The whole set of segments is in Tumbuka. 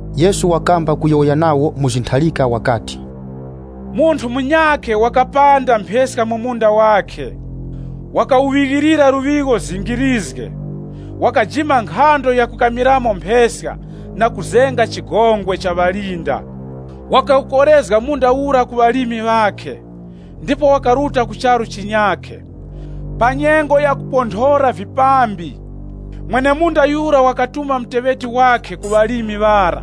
Yesu wakamba kuyowoya nawo mu zintharika wakati, “Munthu munyakhe wakapanda mpheska mu munda wakhe. Wakawuŵighilira luŵigho zingirizge. Wakajima nkhando ya kukamiramo mpheska, na kuzenga chigongwe cha ŵalinda. Wakawukorezga munda ura ku ŵalimi ŵakhe, ndipo wakaruta ku charu chinyakhe. Pa nyengo ya kuponthora vipambi, mwene-munda yura wakatuma muteŵeti wakhe ku ŵalimi ŵara,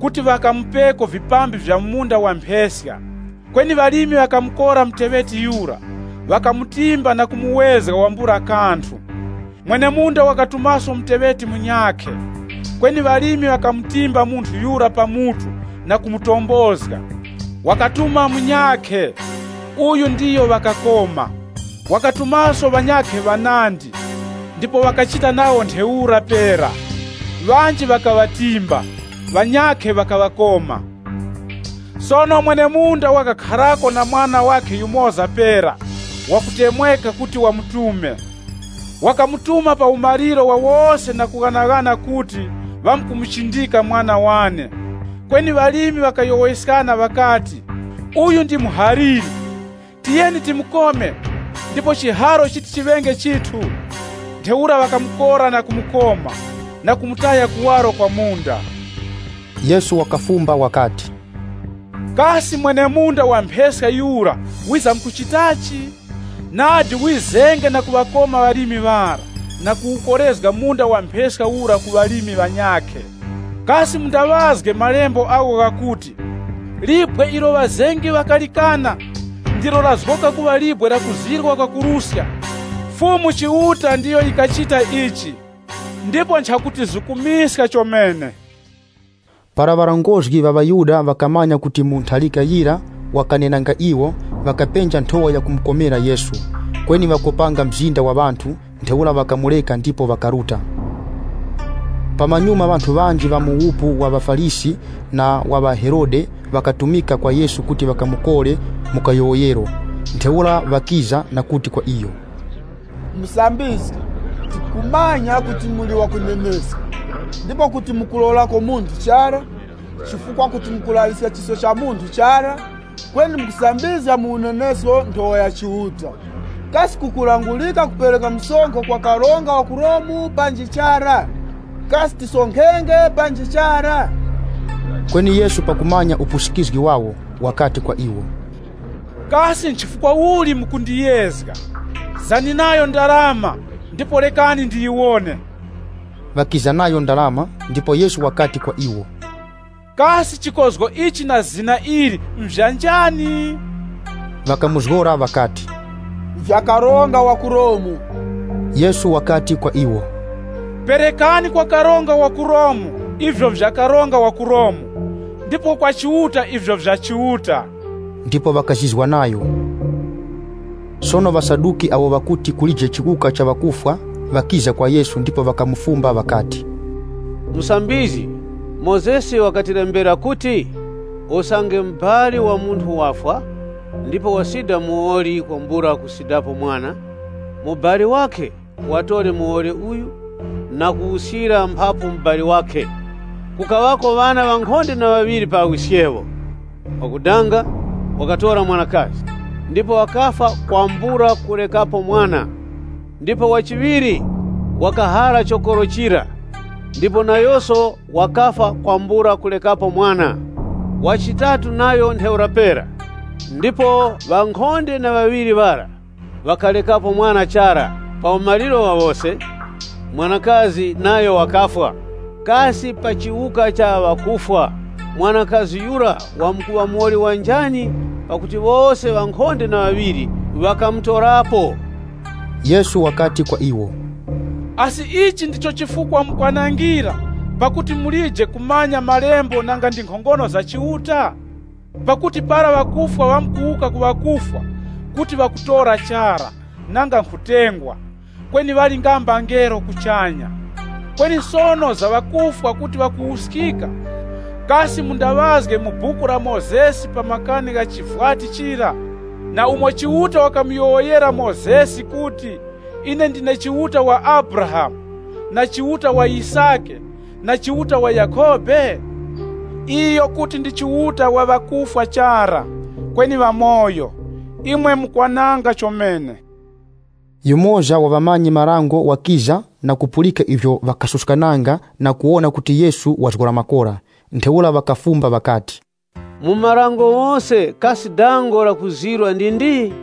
kuti ŵakamupeko vipambi vya mu munda wa mpheska. Kweni ŵalimi ŵakamukora muteŵeti yura, ŵakamutimba na kumuwezga wambula kanthu. Mwene-munda wakatumaso muteŵeti munyakhe, kweni ŵalimi ŵara ŵakamutimba munthu yura pa mutu na kumutombozga. Wakatuma munyakhe, uyu ndiyo ŵakakoma. Wakatumaso ŵanyakhe ŵanandi, ndipo ŵakachita nawo ntheura pera, ŵanji ŵakaŵatimba, ŵanyakhe ŵakaŵakoma. Sono mwene-munda wakakharako na mwana wakhe yumoza pera wakutemweka kuti wamutume. Wakamutuma pa umaliro wa wose na kughanaghana kuti, ‘Ŵamkumuchindika mwana wane.’ Kweni ŵalimi ŵakayowoyeskana ŵakati, ‘Uyu ndi muhaliri. Tiyeni timukome, ndipo chiharo chiti chiŵenge chithu.’ Ntheura ŵakamukora na kumukoma, na kumutaya kuwaro kwa munda.” Yesu wakafumba wakati, “Kasi mwene-munda wa mpheska yura wizamkuchitachi? Nadi wizenge na kuŵakoma ŵalimi ŵara na kuwukorezga munda wa mpheska ura ku ŵalimi ŵanyakhe. Kasi mundaŵazge malembo agho ghakuti, ‘Libwe ilo ŵazengi ŵakalikana, ndilo lazgoka nkhorezgero ya chingodya. Fumu Chiuta ndiyo wakachita ichi ndipo nchakutizukumiska chomene.’” Para ŵarongozgi ŵa ŵaYuda ŵakamanya kuti mu ntharika yira wakanenanga iwo, ŵakapenja nthowa yakumukorera Yesu. Kweni ŵakopanga mzinda wa ŵanthu, ntheura ŵakamureka ndipo ŵakaruta. Pamanyuma ŵanthu ŵanji ŵa mu wupu wa ŵaFarisi na wa ŵaHerode ŵakatumika kwa Yesu kuti ŵakamukore mu kayowoyero. Ntheura ŵakiza na kuti kwa iyo, “Musambizgi, tikumanya kuti muli ŵakuneneska, ndipo kuti mukulorako munthu chara, chifukwa kuti mukulaŵiska chisko cha munthu chara, kweni mukusambizga mu unenesko nthowa ya Chiuta. Kasi kukulangurika kupereka msonkho kwa karonga wa ku Romu panji chara?” Kasi tisonkhenge panji chara? Kweni Yesu pakumanya upusikizgi wawo, wakati kwa iwo, “Kasi chifukwa uli mukundiyezga? Zani nayo ndarama ndipo rekani ndiyiwone.” Ŵakiza nayo ndarama, ndipo Yesu wakati kwa iwo, “Kasi chikozgo ichi na zina ili nvya njani?” Ŵakamuzgora ŵakati, “Nvya karonga wa ku Romu.” Yesu wakati kwa iwo, “Perekani kwa karonga wa ku Romu ivyo nvya karonga wa ku Romu, ndipo kwa Chiuta ivyo nvya Chiuta.” Ndipo ŵakazizwa nayo. Sono ŵaSaduki, awo ŵakuti kulije chiwuka cha ŵakufwa, ŵakiza kwa Yesu ndipo ŵakamufumba ŵakati, “Musambizgi, Mozesi wakatilembera kuti, ‘Usange mubali wa munthu wafwa, ndipo wasida muwoli kwambula kusidapo mwana, mubali wakhe watore muwoli uyu na kuwuskira mphapu mubali wakhe.’ Kukaŵako ŵana ŵankhonde na ŵaŵiri pa wiskewo. Wakudanga wakatora mwanakazi, ndipo wakafwa kwambula kurekapo mwana. Ndipo wa chiŵiri wakahara chokoro chira, ndipo nayoso wakafwa kwambula kurekapo mwana. Wa chitatu nayo ntheura pera. Ndipo ŵankhonde na ŵaŵiri ŵara ŵakarekapo mwana chara. Pa umaliro wa wose, mwanakazi nayo wakafwa. Kasi pa chiwuka cha ŵakufwa, mwanakazi yura wamkuŵa muwoli wa njani, pakuti wose ŵankhonde na ŵaŵiri ŵakamutorapo?” Yesu wakati kwa iwo, “Asi ichi ndicho chifukwa mukwanangira, pakuti mulije kumanya Malembo nanga ndi nkhongono za Chiuta? Pakuti para ŵakufwa ŵamkuwuka ku ŵakufwa, kuti ŵakutora chara, nanga nkhutengwa, kweni ŵali nga mbangelo kuchanya. Kweni sono za ŵakufwa kuti ŵakuwuskika, kasi mundaŵazge mu Buku la Mozesi pa makani gha chivwati chira, na umo Chiuta wakamuyowoyera Mozesi kuti, ‘Ine ndine Chiuta wa Abrahamu, na Chiuta wa Yisake, na Chiuta wa Yakhobe? Iyo kuti ndi Chiuta wa ŵakufwa chara, kweni wa ŵamoyo. Imwe mukwananga chomene.’” Yumoza wa ŵamanyi-marango wakiza na kupulika ivyo ŵakasuskananga na kuwona kuti Yesu wazgora makora. Ntheura ŵakafumba ŵakati, “Mu marango ghose kasi dango lakuzirwa ndi ndi?”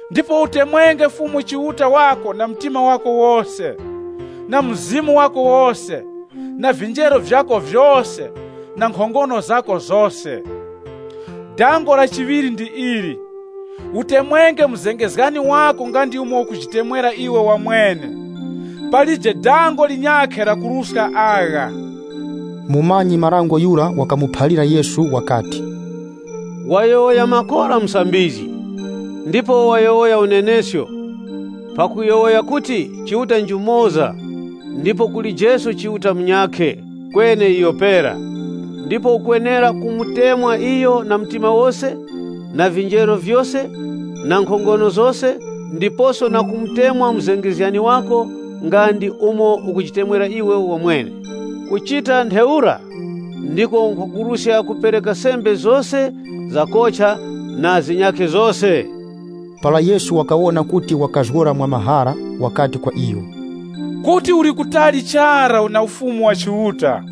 Ndipo utemwenge Fumu Chiuta wako na mtima wako wose, na mzimu wako wose, na vinjeru vyako vyose, na nkhongono zako zose.’ Dango la chiŵiri ndi ili, ‘Utemwenge muzengezgani wako nga ndi umo ukujitemwera wamwene!’ Palije dango linyakhe lakuruska agha.” Mumanyi-marango yura wakamuphalira Yesu wakati, “Wayowoya makora Musambizgi, ndipo wayowoya unenesko pakuyowoya kuti Chiuta njumoza pera ndipo palije Chiuta munyakhe kweni iyo pera. Ndipo ukwenera kumutemwa iyo na mtima wose, na vinjeru vyose, na nkhongono zose, ndiposo na kutemwa muzengezgani wako nga ndi umo ukujitemwera iwe wamwene. Kuchita ntheura, ndiko nkhwakuruska kupereka sembe zose zakocha na zinyakhe zose.” Para Yesu wakawona kuti wakazgora mwamahara, wakati kwa iyo, “Kuti uli kutali chara na Ufumu wa Chiuta.”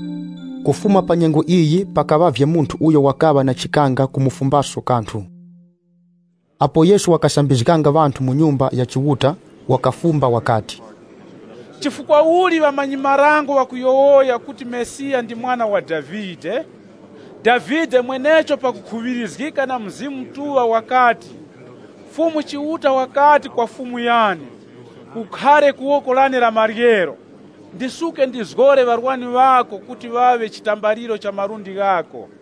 Kufuma pa nyengo iyi, pakaŵavye munthu uyo wakaŵa na chikanga kumufumbaso kanthu. Apo Yesu wakasambizganga ŵanthu mu Nyumba ya Chiuta wakafumba wakati, “Chifukwa uli ŵamanyi-marango ŵakuyowoya kuti Mesiya ndi mwana wa Davide? Davide mwenecho pakukhuŵirizgika na Mzimu Mutuŵa wakati, ‘Fumu Chiuta wakati kwa Fumu yane, Khara ku woko lane la maryero, ndisuke ndiŵazgore ŵarwani ŵako, kuti ŵaŵe chitambaliro cha malundi ghako.’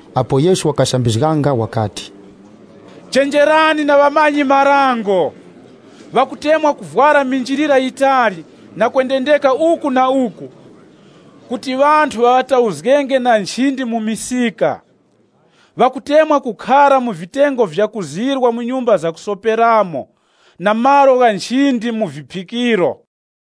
Apo Yesu wakasambizganga, wakati, “Chenjerani na ŵamanyi-marango. Ŵakutemwa kuvwara minjilira yitali na kwendendeka uku na uku kuti ŵanthu ŵa ŵatauzgenge na nchindi mu misika. Ŵakutemwa kukhara mu vitengo vyakuzirwa mu nyumba zakusoperamo na malo gha nchindi mu viphikiro.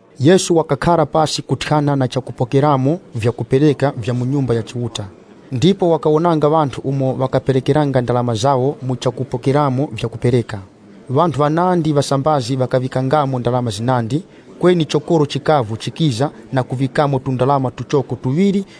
Yesu wakakhara pasi kuthyana na chakupokeramo vyakupereka vya mu Nyumba ya Chiuta. Ndipo wakawonanga ŵanthu umo ŵakaperekeranga ndarama zawo mu chakupokeramo vyakupereka. Ŵanthu ŵanandi ŵasambazi ŵakaŵikangamo ndarama zinandi, kweni chokoro chikavu chikiza na kuŵikamo tundarama tuchoko tuŵiri.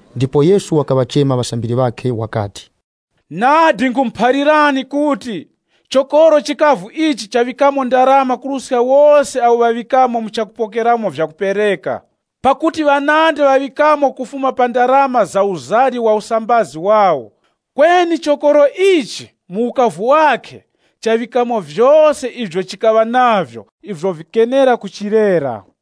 Ndipo Yesu wakaŵachema ŵasambiri ŵakhe wakati, “Nadi nkhumuphalirani kuti, chokoro chikavu ichi chaŵikamo ndarama kuruska wose awo ŵaŵikamo mu chakupokeramo vyakupereka. Pakuti ŵanandi ŵaŵikamo kufuma pa ndarama za uzari wa usambazi wawo. Kweni chokoro ichi mu ukavu wakhe chaŵikamo vyose ivyo chikaŵa navyo ivyo vikenera kumulera.”